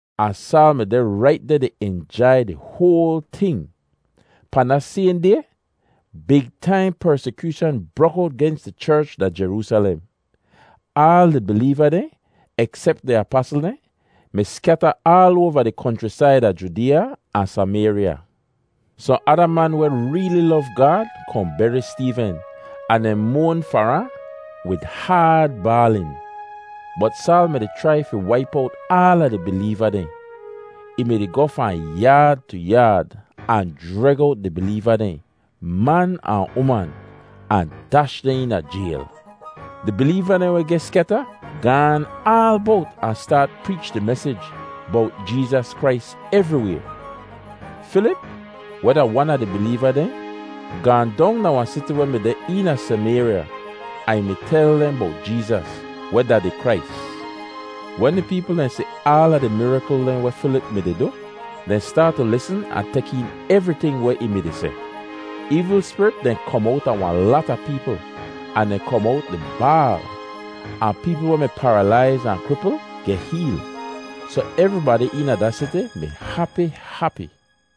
Ahn Saal mi deh rait deh di injai di hoal ting. Pahn da sayhn day big taim persikyooshan brok owt gens di cherch da Jeroosalem. Aal di bileeva dehn, eksep di apasl dehn, mi skyata aal oava di konchrisaid a Judeeya ahn Samayrya. Sohn ada man weh reeli lov Gaad kohn beri Steeven ahn dehn moan far ahn wid haad baalin. Bot Saal mi-di chrai fi waip owt aala di bileeva dehn. Ih mi-di goh fahn yaad tu yaad ahn jreg owt di bileeva dehn, man ahn uman, ahn dash dehn eena jayl. Di bileeva dehn weh geh skyata gaan aal bowt ahn staat preech di mesij bowt Jeezas Krais evriway. Filip, weh da wan a di bileeva dehn, gaahn dong da wahn siti weh mi deh eena Samayrya, ahn ih mi tel dehn bowt Jeezas, weh da di Krais. Wen di peepl dehn si aala di mirakl dehn weh Filip mi-di du, dehn staat tu lisn ahn tek een evriting weh ih mi-di seh. Eevl spirit dehn kom owta wahn lata peepl, ahn dehn kom owt di baal. Ahn peepl weh mi paralaiz ahn kripl geh heel. Soh evribadi eena da siti mi hapi hapi.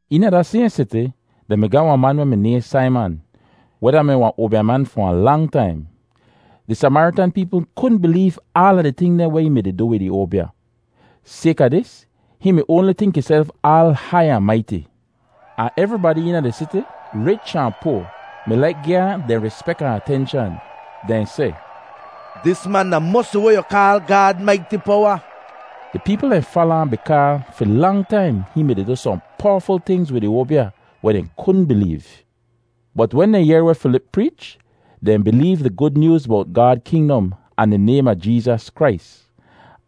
Eena da sayhn siti, dehn mi ga wahn man nayhn Saiman, weh da-mi wahn oabyaman fi wahn lang taim. Di Samaritan peepl kudn bileev aala di ting dehn weh ih mi-di du wid ih oabya. Sayka dis, hihn mi oanli tink ihself aal hai ahn maiti. Ahn evribadi eena di siti, rich ahn poa, mi laik gi ahn dehn rispek ahn atenshan. Dehn seh, “Dis man da mosi weh yu kaal ‘Gaad maiti powa!’” Di peepl dehn fala ahn bikaa fi lang taim ih mi-di du sohn powaful tingz wid ih oabya weh dehn kudn bileev. Bot wen dehn yehr weh Filip preech, dehn bileev di Gud Nyooz bowt Gaad kingdom ahn di naym a Jeezas Krais.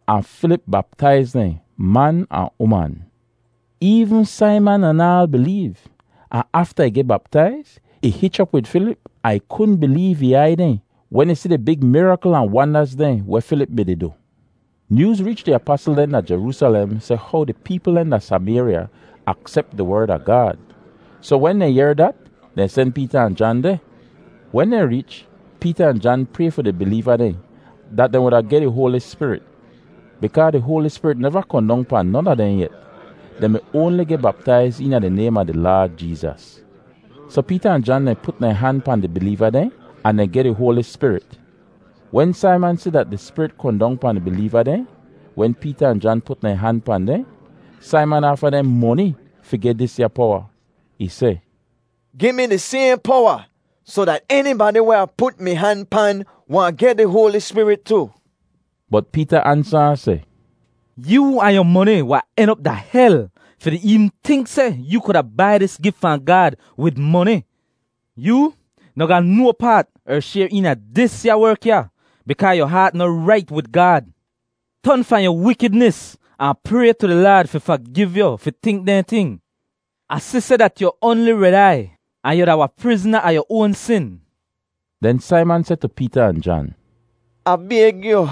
Ahn Filip baptaiz dehn, man ahn uman! Eevn Saiman anaal bileev, ahn afta ih geh baptaiz, ih hich op wid Filip ahn ih kudn bileev ih aiy dehn wen ih si di big mirakl ahn wandaz dehn weh Filip mi-di du. Nyooz reech di apasl dehn da Jeroosalem seh how di peepl dehn da Samayrya aksep di Werd a Gaad. Soh wen dehn yehr dat, dehn sen Peeta ahn Jan deh. Wen dehn reech, Peeta ahn Jan pray fi di bileeva dehn dat dehn wuda geh di Hoali Spirit bikaa di Hoali Spirit neva kohn dong pahn non a dehn yet. Dehn mi oanli geh baptaiz eena di naym a di Laad Jeezas. Soh Peeta ahn Jan put dehn han pahn di bileeva dehn ahn dehn geh di Hoali Spirit. Wen Saiman si dat di Spirit kohn dong pahn di bileeva dehn wen Peeta ahn Jan put dehn han pahn dehn, Saiman aafa dehn moni fi geh disya powa. Ih seh, “Gi mi di sayhn powa soh dat enibadi weh Ah put mi han pan wahn geh di Hoali Spirit tu.” Bot Peeta ansa ahn seh, “Yoo ahn yu moni wahn en op da hel fi di eevn tink seh yu kuda bai dis gif fahn Gaad wid moni! Yoo noh ga no paat er shayr eena disya werk ya bikaa yu haat noh rait wid Gaad. Ton fahn yu wikidnis ahn pray tu di Laad fi fagiv yu fi tink dehn ting. Ah si seh dat yu oanli red aiy ahn yu da wahn prizna a yu oan sin.” Den Saiman seh tu Peeta ahn Jan, “Ah bayg yu,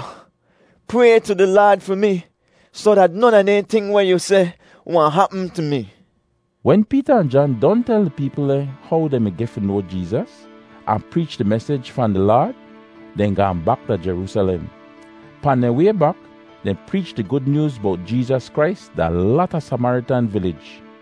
pray tu di Laad fi mi soh dat non a di ting dehn weh yu seh wahn hapm tu mi.” Wen Peeta ahn Jan don tel di peepl dehn how dehn mi geh fi noa Jeezas, ahn preech di mesij fahn di Laad, dehn gaahn bak da Jeroosalem. Pahn dehn way bak, dehn preech di Gud Nyooz bowt Jeezas Krais da lata Samaritan vilij.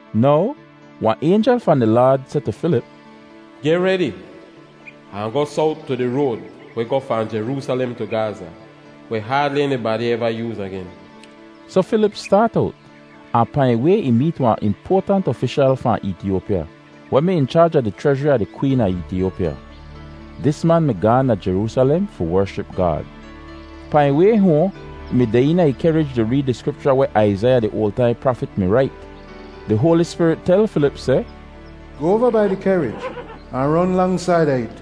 Now wahn aynjel fahn di Laad seh tu Filip, “Geh redi ahn goh sowt tu di road weh goh fahn Jeroosalem tu Gaza, weh haadli enibadi eva yooz agen.” Soh Filip staat owt, ahn pahn ih way ih meet wahn impoatant ofishal fahn Eetiyopya, weh mi in chaaj a di chrezhri a di kween a Eetiyopya. Dis man mi gaahn da Jeroosalem fi wership Gaad. Pahn ih way hoahn ih mi deh eena ih kehrij di reed di Skripcha weh Aizaiya di oal taim prafit mi rait. Di Hoali Spirit tel Filip seh, “Goh oava bai di kehrij ahn ron lang saida it.”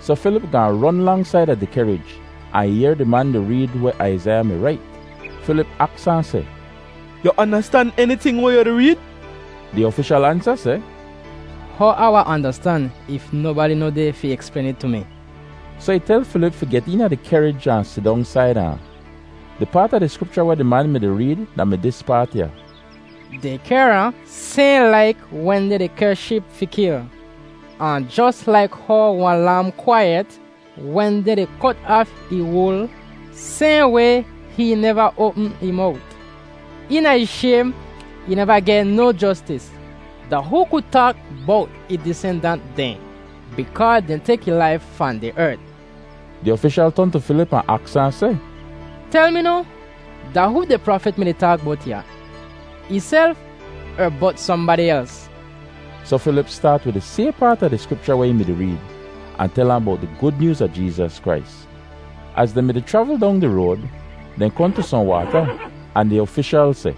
Soh Filip gaahn ron lang saida di kehrij, ahn ih yehr di man di reed weh Aizaiya mi rait. Filip aks ahn seh, “Yu andastan eniting weh yu di reed?” Di ofishal ansa seh, “How Ah wahn andastan if nobadi noh deh fi eksplayn it tu mi?” Soh ih tel Filip fi get eena di kehrij ahn sidong saida ahn. Di paat a di Skripcha weh di man mi-di reed da-mi dis paat ya: “Dehn kehr ahn sayhn laik wen dehn di kehr sheep fi kil, ahn jos laik how wahn lam kwaiyet wen dehn di kot aaf ih wul, sayhn way hihn neva oapm ih mowt. Eena ih shaym ih neva geh no jostis. Da hoo ku taak bowt ih disendant dehn? Bikaa dehn tek ih laif fahn di ert.” Di ofishal ton tu Filip ahn aks ahn seh, “Tel mi noh, da hoo di prafit mi-di taak bowt ya, ihself er bowt sohnbadi els?” Soh Filip staat wid di sayhn paat a di Skripcha weh ih mi-di reed ahn tel ahn bowt di Gud Nyooz a Jeezas Krais. Az dehn mi-di chravl dong di road, dehn kohn tu sohn waata ahn di ofishal seh,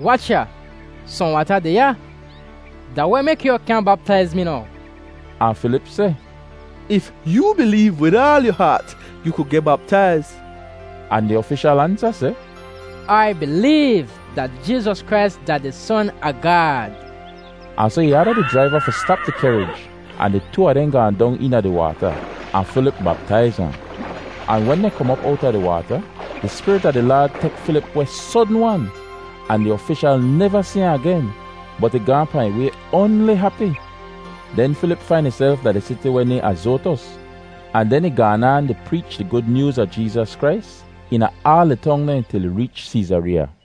“Wach ya, sohn waata deh ya. Da weh mek yu kyaahn baptaiz mi now?” [Ahn Filip seh, “If yoo bileev wid aal yu haat, yu ku geh baptaiz.” Ahn di ofishal ansa seh, “Ai bileev dat Jeezas Krais da di Son a Gaad.”] Ahn soh ih aada di jraiva fi stap di kehrij ahn di too a dehn gaahn dong eena di waata, ahn Filip baptaiz ahn. Ahn wen dehn kom op owta di waata, di Spirit a di Laad tek Filip weh sodn-wan. Ahn di ofishal neva si ahn agen, bot ih gaahn pahn ih way oanli hapi! Den Filip fain ihself da di siti weh nayhn Azotus, ahn den ih gaan aan di preech di Gud Nyooz a Jeezas Krais eena aala di tong dehn til ih reech Seezareeya.